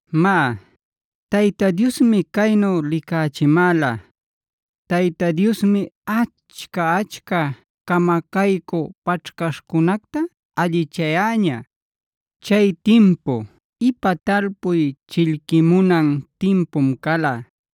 Má, Tayta Diosmi caynu licachimäla. Tayta Diosmi achca-achca camacaycü paćhcaśhcunacta allichayäña. Chay timpu ipa talpuy chillquimunan timpum cala.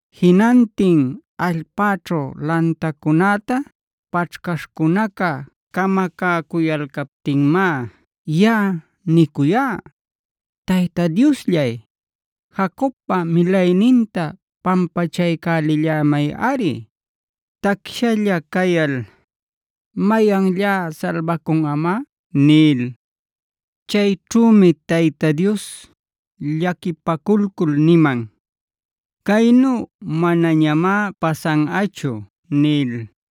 Jinantin allpäćhu lantacunäta paćhcaśhcunaca camacäcuyalcaptinmá yaꞌa nicuyá: “¡Tayta Diosllay, Jacobpa milayninta pampachaycälillämayꞌari! Tacshalla cayal, ¿mayanllá salbacunꞌamá?” nil. Chayćhümi Tayta Dios llaquipaculcul niman: “Caynu manañamá pasanꞌachu” nil.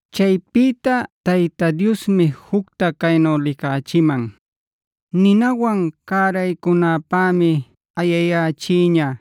Chaypïta Tayta Diosmi jucta caynu licachiman. Ninawan cäraycunanpämi ayayächiña.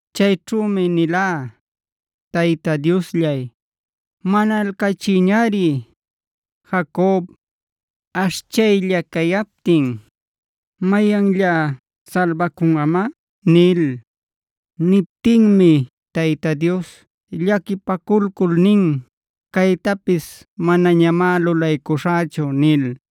Chayćhümi nilá: “Tayta Diosllay, manalcachillayñari. Jacob, ashchaylla cayaptin, ¿mayanllá salbacunꞌamá?” nil. Niptinmi Tayta Dios llaquipaculcul nin: “Caytapis manañamá lulaycuśhächu” nil.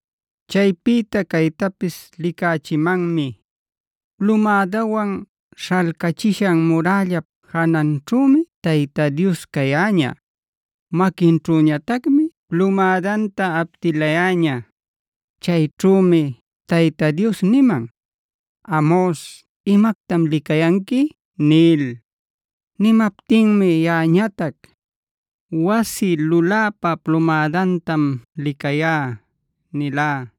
Chaypïta caytapis licachimanmi. Plumädawan śhalcachisha murällap jananćhümi Tayta Dios cayäña. Maquinćhüñatacmi plumädanta aptilayäña. Chayćhümi Tayta Dios niman: “¿Amos, imactam licayanqui?” nil. Nimaptinmi yaꞌañatac: “Wasi luläpa plumädantam licayá” nilá.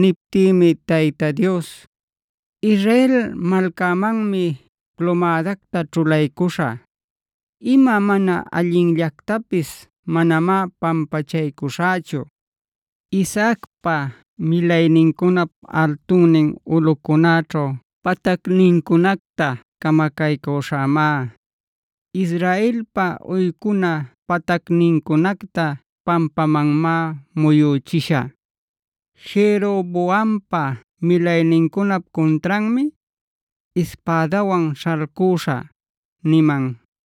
Niptïmi Tayta Dios: “Israel malcämanmi plumädacta ćhulaycuśhä. Ima mana allinllactapis manamá pampachaycuśhächu. Isaacpa milaynincunap altunnin ulꞌucunäćhu patacnincunacta camacaycüśhämá. Israelpa uycuna patacnincunacta pampamanmá muyüchishä. Jeroboampa milaynincunap cuntranmi ispädawan śhalcuśhä” niman.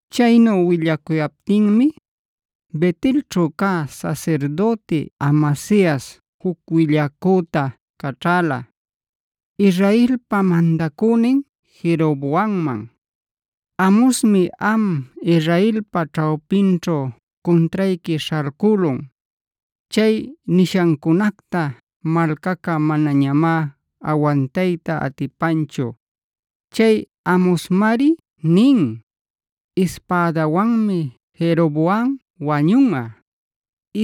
Chaynu willacuptinmi Bet-elćhu cä sasirdüti Amasias juc willacüta caćhäla, Israelpa mandacünin Jeroboamman: “Amosmi am Israelpa ćhawpiquićhu cuntrayqui śhalcülun. Chay nishancunacta malcaca manañamá awantayta atipanchu. Chay Amosmari nin: ‘Ispädawanmi Jeroboam wañunꞌa.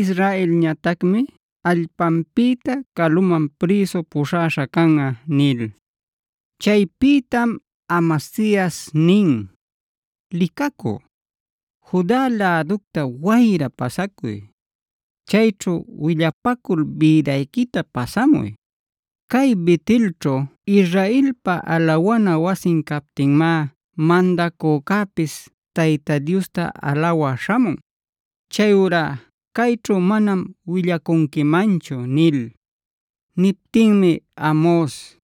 Israelñatacmi allpanpïta caluman prïsu puśhaśha canꞌa’” nil. Chaypïtam Amasias nin: “Licacü, Juda läducta wayra pasacuy. Chayćhu willapacul bïdayquita pasamuy. Cay Bet-elćhu Israelpa alawana wasin captinmá mandacücäpis Tayta Diosta alawä śhamun. Chayurá cayćhu manam willacunquimanchu” nil. Niptinmi Amos: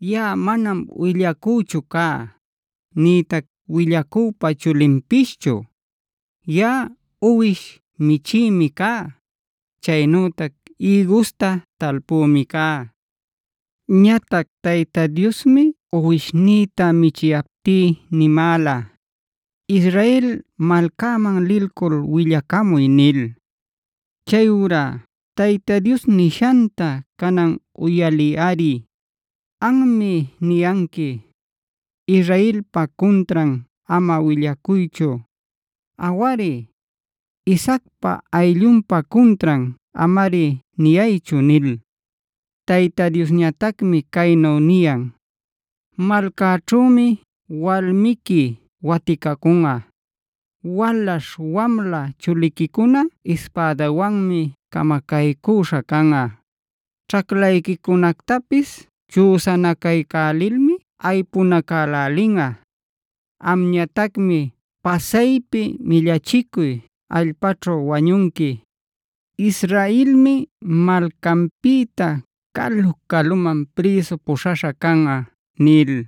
“Yaꞌa manam willacüchu cá, nïtac willacüpa chulinpischu. Yaꞌa uwish michïmi cá; chaynütac ïgusta talpümi cá. Ñatac Tayta Diosmi uwishnïta michiyaptí nimäla: ‘Israel malcäman lilcul willacamuy’ nil. Chayurá Tayta Diosnishanta canan uyaliyꞌari. Anmi niyanqui: ‘Israelpa cuntran ama willacuychu; awari, Isaacpac ayllunpa cuntran amari niyaychu’ nil. Tayta Diosñatacmi caynu niyan: ‘Malcaćhümi walmiqui waticacunꞌa. Walaśh wamla chuliquicuna ispädawanmi camacaycüśha canꞌa. Ćhaclayquicunactapis chüsanacaycälilmi aypunacälälinꞌa. Amñatacmi pasaypi millachicuy allpaćhu wañunqui. Israelmi malcanpïta calu-caluman prïsu puśhaśha canꞌa’” nil.